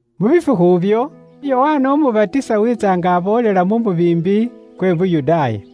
Mu bifukhu ibyo, Yokana Umubatisa wiitsa nga aboolela mu mubiimbi kwa Yuda.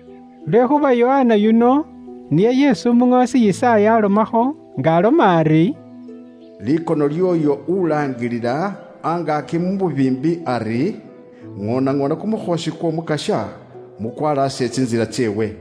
Lwekhuuba Yokana yuno niye isi umuŋoosi Yisaaya aalomakho nga aloma ari: “Likono lyooyo ulaangilila angaaki mu mubiimbi ari, ‘Ŋoonaŋoona kumukhoosi kw'Omukasya, mukwalaase tsintsila tseewe.’”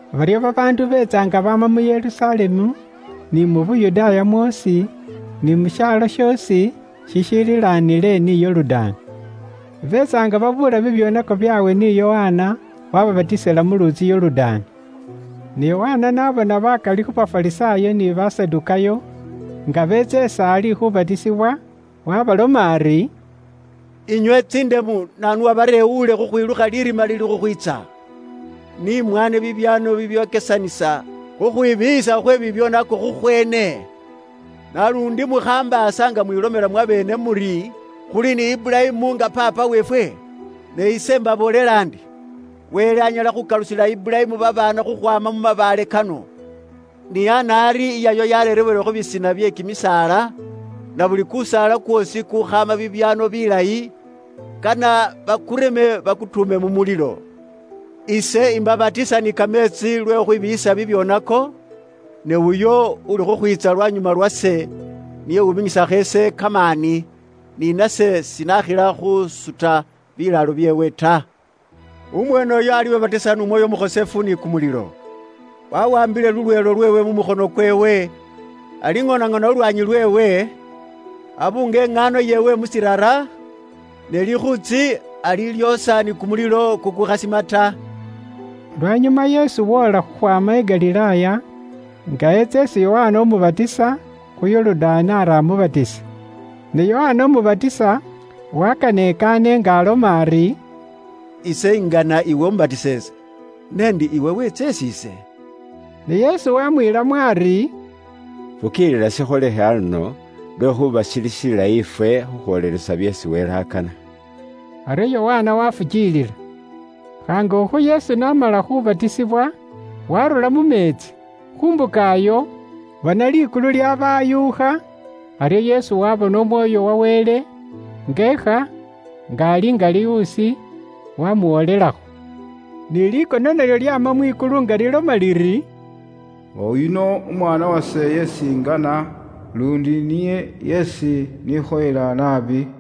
Baryo babaandu beetsa nga baama mu Yerusalemu, ni mu Yuda mwoosi, ni mu shaalo shoosi shishililanile ni Yorudaani. Beetsa nga babuula bibyoonako byaabwe ni Yokana waababatisila mu luutsi Yorudaani. Ne Yokana n'abona bakali khu Bafarisaayo ni Basadukaayo nga beetsa is'ali khuubatisibwa, waabaloma ari, “Inywe tsindemu, naanu uwabarewuule khukhwilukha lirima liliili khukhwiitsa? Ni mwaane bibyaano bibyokesanisa khukhwibiiyisa khwe bibyoonako khukhweene. Naluundi mukhambaasa nga mwiilomela mwabeene muri, ‘Khuli ni Iburayimu nga paapa weefwe’, ne ise imbaboolela ndi, Wele anyala khukalusila Iburayimu babaana khukhwaama mu mabaale kano. Ni ana ari, iyaywa yareerewele khu bisina bye kimisaala, na buli kusaala kwoosi kukhaana bibyaano bilayi, kane bakureme bakutuume mu mulilo. “Ise imbabatisa ni kameetsi lwe khukhwibiiyisa bibyoonako, ne uyo uuli khukhwiitsa lwanyuma lwase, niye uwuminyisakho ise kamaani. Ni nase sinakhila khuusuta bilaalo byeewe ta. Umweeneyo alibabatisa n'Umwoyo Umukhosefu ni kumulilo. Wawaambile lulweelo lweewe mu mukhono kweewe, aliŋoonaŋoona lulwaanyi lweewe, abuunge iŋaano yeewe mu shiirara, ne likhuutsi alilyoosha ni kumulilo kukuukhasima ta.” Lwanyuma Yesu woola khukhwaama i Galilaaya, nga eetsa isi Yokana Umubatisa khu Yorudaani ari amubatise. Ne Yokana Umubatisa wakana ekaane nga aloma ari, “Ise ingana iwe umbatise ise, n'endi iwe wiitsa isi ise?” Ne Yesu waamwiilamo ari, “Fukiilila shikholekhe aluno, lwekhuuba shili shilayi ifwe khukhwoolelesa byeesi Wele akana.” Aryo Yokana waafukiilila. Khaangukho Yesu n'amala khuubatisibwa waarura mu meetsi. Khu mbuka iyo, bona likulu lyaabayuukha, aryo Yesu waabona Umwoyo wa Wele nga eekha, nga ali nga liwuusi, waamuwolelakho. Ni likono nalyo lyaama mwikulu nga liloma liri, “Oyuno Umwaana wase isi ingana, luundi niye isi nikhoyela naabi.”